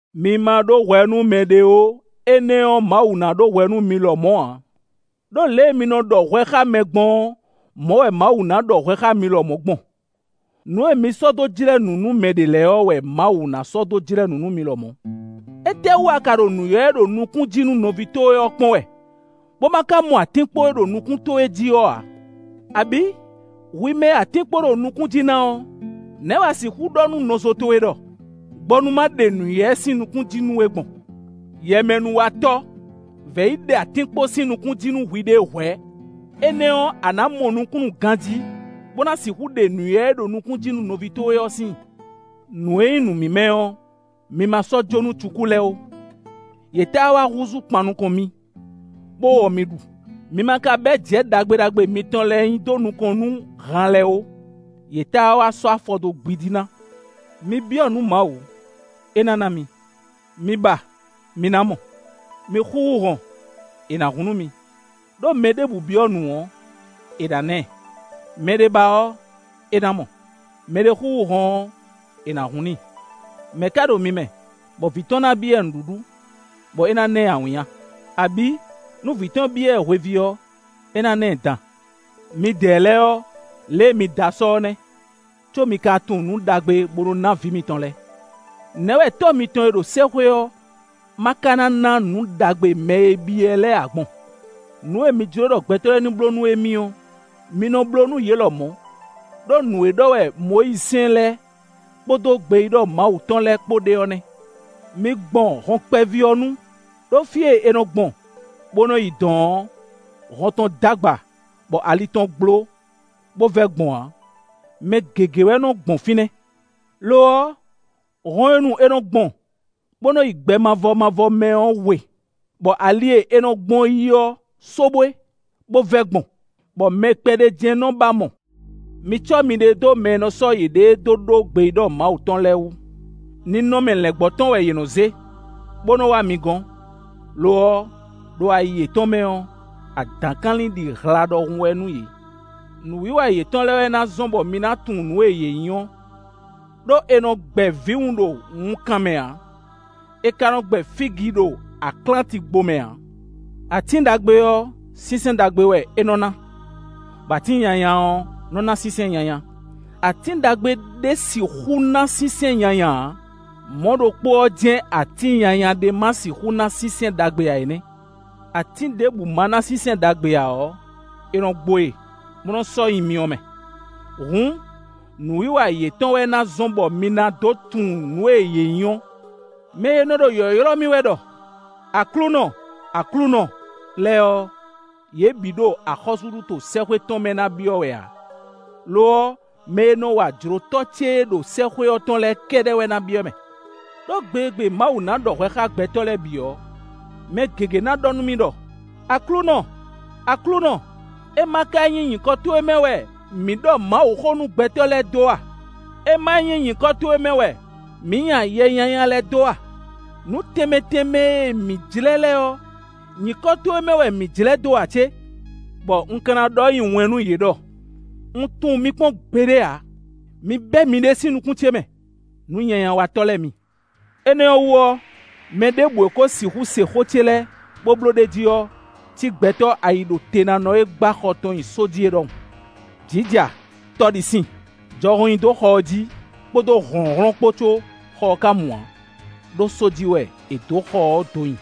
“Mi ma ɖó hwɛ nú mɛɖé ó, énɛ́ ɔ́, Mawu na ɖó hwɛ nú mi lɔmɔ̌ ǎ. Ɖó lě e mi nɔ ɖɔ hwɛ xá mɛ gbɔn ɔ́, mɔ̌ wɛ Mawu na ɖɔ hwɛ xá mi lɔmɔ̌ gbɔn. Nǔ e mi sɔ́ dó jlɛ́ nǔ nú mɛ ɖě lɛ́ɛ ɔ́ wɛ Mawu ná sɔ́ dó jlɛ́ nǔ nú mi lɔmɔ̌. Étɛ́wú a ka ɖo nǔywɛ́ e ɖo nukún jí nú nɔví towe ɔ́ kpɔ́n wɛ, bó má ka mɔ atínkpo e ɖo nukún towe jí ɔ́ ǎ? Abǐ hwi mɛ e atínkpo ɖo nukún jí ná ɔ́, nɛ̌ wɛ a sixú ɖɔ nú nɔzo towe ɖɔ: ‘Gbɔ nú ma ɖe nǔywɛ́ sín nukún jí nú we’ gbɔn? Yɛmɛnúwatɔ́, vɛ̌ yi ɖe atínkpo sín nukún jí nú hwiɖée hwɛ̌; énɛ́ ɔ́, a nǎ mɔ nukúnnú ganjí, bó ná sixú ɖe nǔywɛ́ e ɖo nukún jí nú nɔví towe ɔ́ síin. “Nǔ e nyí nǔ mímɛ́ ɔ́, mi ma sɔ́ jó nú cukú lɛ́ɛ ó; yě táá wá húzú kpan nukɔn mi, bó wɔ mi ɖu. Mi ma ka bɛ́ jɛ̌ ɖagbe ɖagbe mitɔn lɛ́ɛ nyi dó nukɔn nú han lɛ́ɛ ó; yě táá wá sɔ́ afɔ dó gbídí ná. “Mi byɔ́ nǔ Mawu, é ná ná mi; mi ba, mi ná mɔ; mi xúxú hɔn, è nǎ hun nú mi. Ɖó mɛ ɖěbǔ byɔ́ nǔ ɔ́, è nǎ ná ɛ; mɛɖé ba ɔ́, é ná mɔ; mɛɖé xúxú hɔn ɔ́, è nǎ hun n'i. Mɛ̌ ka ɖo mi mɛ, bɔ vǐ tɔn ná byɔ́ ɛ nǔɖuɖu, bɔ é ná ná ɛ awǐnnya? Abǐ, nú vǐ tɔn byɔ́ ɛ hweví ɔ́, é ná ná ɛ dan? Midɛɛ lɛ́ɛ ɔ́, lě e mi dá sɔ ɔ́ nɛ́, có mi ka tunwun nǔ ɖagbe bo nɔ ná vǐ mitɔn lɛ́ɛ. Nɛ̌ wɛ Tɔ́ mitɔn e ɖo sɛ́xwé ɔ́ ma ka ná ná nǔ ɖagbe mɛ e byɔ́ ɛ lɛ́ɛ ǎ gbɔn? “Nǔ e mi jló ɖɔ gbɛtɔ́ lɛ́ɛ ní bló nú émí ɔ́, mi nɔ bló nú yě lɔmɔ̌; ɖó nǔ e ɖɔ wɛ Mɔyízi sɛ́n lɛ́ɛ, kpódó gbeyíɖɔ Mawu tɔn lɛ́ɛ kpó ɖe ɔ́ nɛ́. “Mi gbɔn hɔn kpɛví ɔ́ nu; ɖó fí e è nɔ gbɔn, bó nɔ yi dɔn ɔ́, hɔn tɔn d'agba, bɔ ali tɔn gbló, bo vɛ́ gbɔn ǎ; mɛ gěgé wɛ nɔ gbɔn fínɛ́. Lo ɔ́, hɔn e nu è nɔ gbɔn, bó nɔ́ yi gbɛ mavɔ mavɔ mɛ ɔ́ hwe, bɔ ali e è nɔ gbɔn yi ɔ́ sóbwé, bó vɛ́ gbɔn, bɔ mɛ kpɛɖé jɛ́n nɔ ba mɔ.” “Mi cɔ́ miɖée dó mɛ e nɔ sɔ́ yěɖée dó ɖó gbeyíɖɔ Mawu tɔn lɛ́ɛ wú. Ninɔmɛ lɛ̌ngbɔ́ tɔn wɛ yě nɔ zé, bó nɔ́ wá mi gɔ́n; lo ɔ́, ɖo ayi yětɔn mɛ ɔ́, adǎnkanlin ɖi hla ɖɔhun wɛ nú yě. Nǔwiwa yětɔn lɛ́ɛ wɛ na zɔ́n bɔ mi na tunwun nǔ e yě nyí ɔ́; ɖó è nɔ gbɛ vǐwun ɖo wunkan mɛ ǎ, è ka nɔ gbɛ fígi ɖo aklánti gbo mɛ ǎ. Atín ɖagbe ɔ́, sínsɛ́n ɖagbe wɛ é nɔ́ ná, bɔ atín nyanya nɔ ná sínsɛ́n nyanya. Atín ɖagbe ɖé sixú ná sínsɛ́n nyanya ǎ; mɔ̌ ɖokpó ɔ́ jɛ́n atín nyanya ɖé ma sixú ná sínsɛ́n ɖagbe ǎ é nɛ́. Atín ɖěbǔ ma ná sínsɛ́n ɖagbe ǎ ɔ́, è nɔ gbo e, bo nɔ sɔ́ nyi myɔ mɛ. Hǔn, nǔwiwa yětɔn wɛ ná zɔ́n bɔ mi na dó tunwun nǔ e yě nyí ɔ́. “Mɛ e nɔ ɖo ylɔ̌ylɔ́ mì wɛ ɖɔ: ‘Aklúnɔ, Aklúnɔ’ lɛ́ɛ ɔ́, yě bǐ ɖo axɔ́súɖuto sɛ́xwé tɔn mɛ na byɔ́ wɛ ǎ; lo ɔ́, mɛ e nɔ wa jlǒ Tɔ́ ce e ɖo sɛ́xwé ɔ́ tɔn lɛ́ɛ kɛ́ɖɛ́ wɛ na byɔ́ mɛ. Ɖó gbe e gbe Mawu ná ɖɔ hwɛ xá gbɛtɔ́ lɛ́ɛ bǐ ɔ́, mɛ gěgé ná ɖɔ nú mì ɖɔ: ‘Aklúnɔ, Aklúnɔ, é ma ka nyí nyǐkɔ towe mɛ wɛ mǐ ɖɔ Mawuxó nú gbɛtɔ́ lɛ́ɛ dó a? É ma nyí nyǐkɔ towe mɛ wɛ mǐ nya yɛ nyanya lɛ́ɛ dó a? Nǔ tɛnmɛ tɛnmɛ e mǐ jlɛ́ lɛ́ɛ ɔ́, nyǐkɔ towe mɛ wɛ mǐ jlɛ́ dó ǎ cé?’ Bɔ un ka na ɖɔ nyi wɛn nú yě ɖɔ: ‘Un tunwun mi kpɔ́n gbeɖé ǎ; mi bɛ́ miɖée sín nukún ce mɛ, nǔnyanyawatɔ́ lɛ́ɛ mi.’” “Énɛ́ ɔ́ wú ɔ́, mɛ ɖěbǔ e ko sixú se xó ce énɛ́ lɛ́ɛ bo bló d'é jí ɔ́, cí gbɛtɔ́ ayiɖotenánɔ e gbá xɔ tɔn nyi só jí é ɖɔhun. Jǐ ja, tɔ ɖi sin, jɔhɔn nyi dó xɔ ɔ́ jí kpódó hlɔ̌nhlɔ́n kpó có xɔ ɔ́ ka mu ǎ, ɖó só jí wɛ è dǒ xɔ ɔ́ do nyi.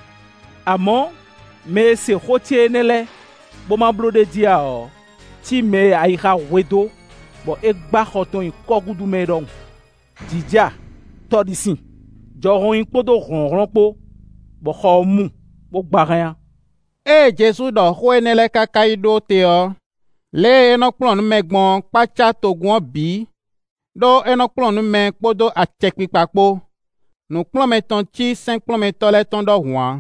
Amɔ̌, mɛ e se xó ce énɛ́ lɛ́ɛ, bó ma bló d'é jí ǎ ɔ́, cí mɛ e ayixa hwedó, bɔ é gbá xɔ tɔn nyi kɔ́gúdu mɛ é ɖɔhun. Jǐ ja, tɔ ɖi sin, jɔhɔn nyi kpódó hlɔ̌nhlɔ́n kpó, bɔ xɔ ɔ́ mu, bó gba hánnyá.” Ée Jezu ɖɔ xó énɛ́ lɛ́ɛ káká yi ɖó te ɔ́, lě e é nɔ́ kplɔ́n nǔ mɛ gbɔn ɔ́ kpácá togun ɔ́ bǐ, ɖó é nɔ́ kplɔ́n nǔ mɛ kpódó acɛkpikpa kpó. Nǔkplɔ́nmɛ tɔn cí sɛ́nkplɔ́nmɛtɔ́ lɛ́ɛ tɔn ɖɔhun ǎ.